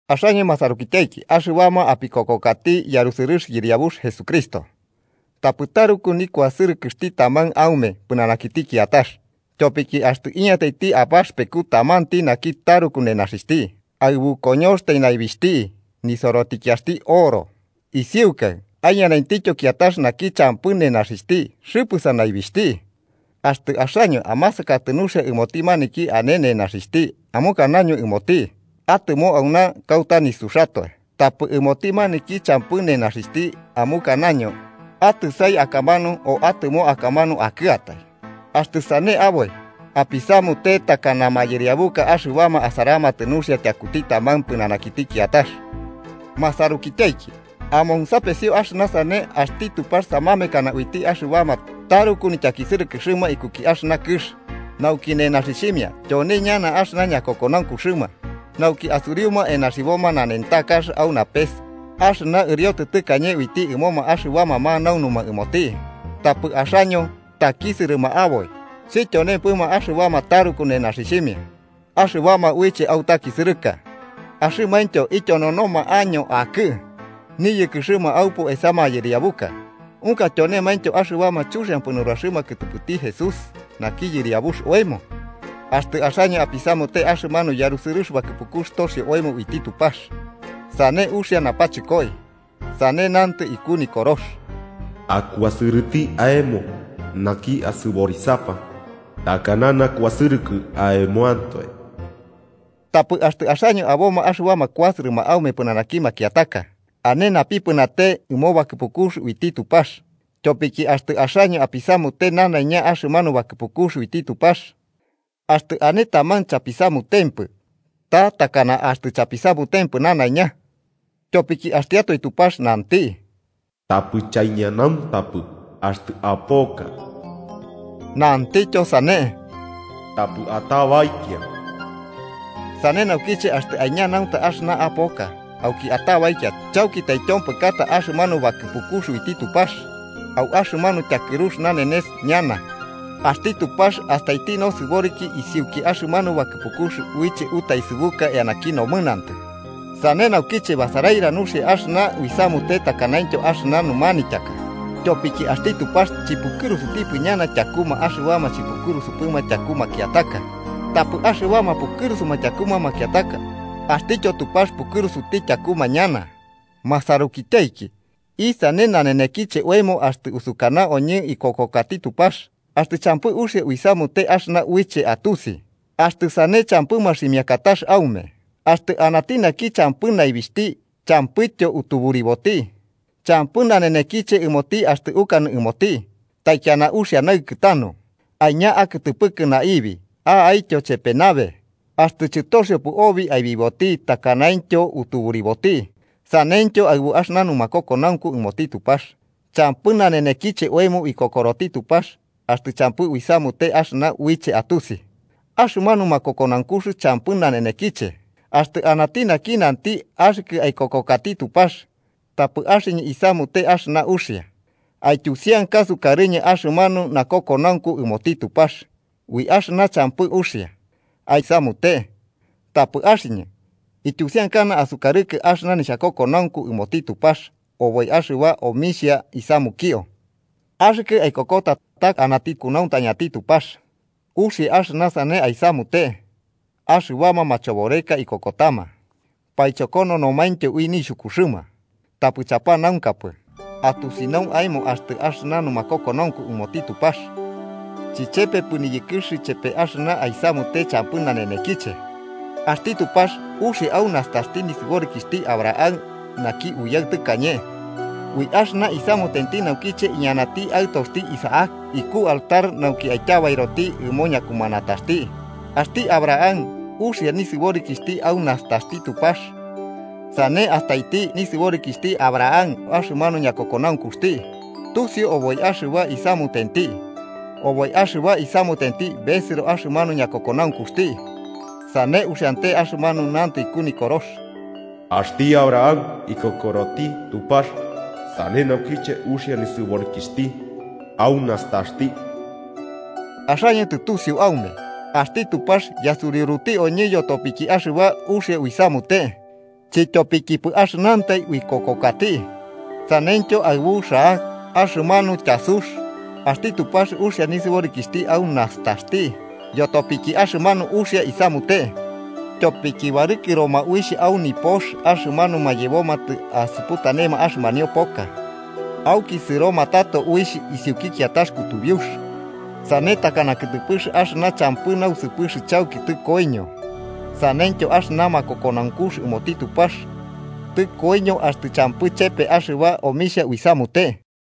Axaño masarukityaiki, axɨbama apikokokati yarusɨrɨx Yɨriabux Jesucristo, tapɨ taruku nikuasɨrɨkɨxti taman aume pɨnanakiti kiatax. Tyopiki axtɨ iñataiti abaxɨpeku tamanti naki taruku nenaxixhti, aɨbu koñoxtai naibixhti nisorotikiaxti oro, isiukai aiñanaitityo kiatax naki champɨ nenaxixhti xɨpɨsa naibixhti. Axtɨ axaño amasakatɨ nuxia ɨmoti maniki ane nenaxixhti amukanaño ɨmoti: “Atɨmo auna kauta nisuxatoe”, tapɨ ɨmoti maniki champɨ nenaxixhti amukanaño: “Atɨsai akamanu o atɨmo akamanu akɨatai”, axtɨ sane aboi, apisamute takana mayɨriabuka axɨbama asaramatɨ nuxia tyakuti taman pɨnanakiti kiatax. Masarukityaiki, amonsapesio axɨna sane: Axti Tupax samamekanama uiti axɨbama taruku nityakisɨrɨkɨxɨma ikuki axɨna kɨx, nauki nenaxixhimia tyone ñana axɨna ñakokonaunkuxɨma nauki asuriuma enaxiboma nanentakax au napes axɨna ɨriotɨ tɨkañe uiti ɨmoma axɨbama manaunuma ɨmoti. Tapɨ axaño, takisɨrɨma aboi. ¿Chityonempɨma axɨbama taruku nenaxixhimia axɨbama uiche autakisɨrɨka, axɨmaintyo ityononoma año akɨ niyɨkɨxɨma aupu esa mayɨriabuka? ¿Unka tyonemaintyo axɨbama chuxiampɨ nuraxɨma kɨtɨpɨti Jesús naki Yɨriabux oemo? Axtɨ axaño apisamute axɨmanu yarusɨrɨx bakɨpukux toxio oemo uiti Tupax, sane uxia napachɨkoi. Sane Nantɨ iku Nikorox: “Akuasɨrɨti aemo naki asɨborisapa takana nakuasɨrɨkɨ aemoantoe.” Tapɨ axtɨ axaño aboma axɨbama kuasɨrɨma aume pɨnanaki makiataka, ane napipɨnate ɨmo bakɨpikux uiti Tupax. Tyopiki axtɨ axaño apisamute nanaiña axɨmanu bakɨpukux uiti Tupax, axtɨ ane taman chapisamutempɨ, ta takana axtɨ chapisamutempɨ nanaiña. Tyopiki axtiatoe Tupax nanti: “Tapɨ chaiñanauntapɨ axtɨ apoka”, nantityo sane: “Tapɨ atabaikia.” Sane naukiche axtɨ aiñanaunta axɨna apoka, auki atabaikia, chauki taityompɨkata axɨmanu bakɨpukux uiti Tupax. Au axɨmanu tyakɨrux nanenes ñana, axti Tupax astaiti nosɨboriki isiuki axɨmanu bakɨpukux uiche utaesɨbuka eanaki nomɨnantɨ. Sane naukiche, basaraira nuxia axɨna uisamute takanaintyo axɨna numanityaka. Tyopiki axti Tupax chɨpukɨrusutipɨ ñana tyakuma axɨbama chipukɨrusupɨma tyaku makiataka. Tapɨ axɨbama pukɨrusuma tyakuma makiataka, axtityo Tupax pukɨrusuti tyakuma ñana. Masarukityaiki, ¿isane nanenekiche oemo axtɨ usukana oñɨ uikokokati Tupax, axtɨ champɨ uxia uisamute axɨna uiche atusi? Axtɨ sane champɨ maximiakatax aume. Axtɨ anati naki champɨ naibixhti champɨityo utuburiboti. Champɨ nanenekiche ɨmoti axtɨ ukanɨ ɨmoti: “Taikiana uxia naɨkɨ tanu, aiña akɨtɨpɨkɨ naibi a'aityo chepe nabe”, axtɨ chɨtoxiopɨ obi aibiboti takanaintyo utuburiboti. Saneityo aɨbu axɨna numakokonaunku ɨmoti Tupax, champɨ nanenekiche oemo uikokoroti Tupax axtɨ champɨ uisamute axɨna uiche atusi. Axɨmanu makokonaunkux champɨ nanenekiche. Axtɨ anati naki nanti: “Axɨkɨ aikokokati Tupax, tapɨ axɨñɨ isamute axɨna uxia. Aityusianka sukarɨñɨ axɨmanu nakokonaunku ɨmoti Tupax ui axɨna champɨ uxia aisamute. Tapɨ axɨñɨ, ityusiankana asukarɨkɨ axɨna nixhakokonaunku ɨmoti Tupax oboi axɨba omixhia isamukio.” Axɨkɨ aikokota ta anati kunauntañati Tupax, uxia axɨna sane aisamute. Axɨbama machoboreka ikokotama, paichokokononomaintyo ui nixhukuxɨma. Tapɨ chapanaunkapɨ, atusinau aemo axtɨ axɨna numakokonaunku ɨmoti Tupax chichepepɨ niyɨkɨx chepe axɨna aisamute champɨ nanenekiche. Axti Tupax uxia au nastaxti nisɨborikixhti Abraham naki uyaɨ tɨkañe, ui axɨna isamutenti naukiche iñanati aɨtoxti Isaac iku altar nauki aityabairoti ɨmo ñakumanataxti. Axti Abraham uxia nisɨborikixhti au nastaxti Tupax. Sane astai nisɨborikixhti Abraham axɨmanu ñakokonaunkuxti tusiu oboi axɨba isamutenti, oboi axɨba isamutenti besɨro axɨmanu ñakokonaunkuxti. Sane uxiante axɨmanu nantɨ iku Nikorox: “Axti Abraham ikokoroti Tupax, sane naukiche uxia nisɨborikixhti au nastaxti.” Axaño tɨtusiu aume, axti Tupax yasuriuruti oñɨ yotopiki axɨba uxia uisamute, chityopikipɨ axɨnantai uikokokati. Saneityo aɨbu Rahab, axɨmanu tyasux. Axti Tupax uxia nisɨborikixh au nastaxti yotopiki axɨmanu uxia isamute, tyopiki barɨkɨroma uixh au nipox axɨmanuma yebomatɨ asuputanema axɨmanio poka, auki sɨromatɨ tato uixh isiuki kiatax kutubiux. Sane takana kɨtɨpɨx axɨna champɨ nausɨpɨx chauki tɨkoiño, saneityo axɨna makokonaunkux ɨmoti Tupax tɨkoiño axtɨ champɨ chepe axɨba omixhia uisamute.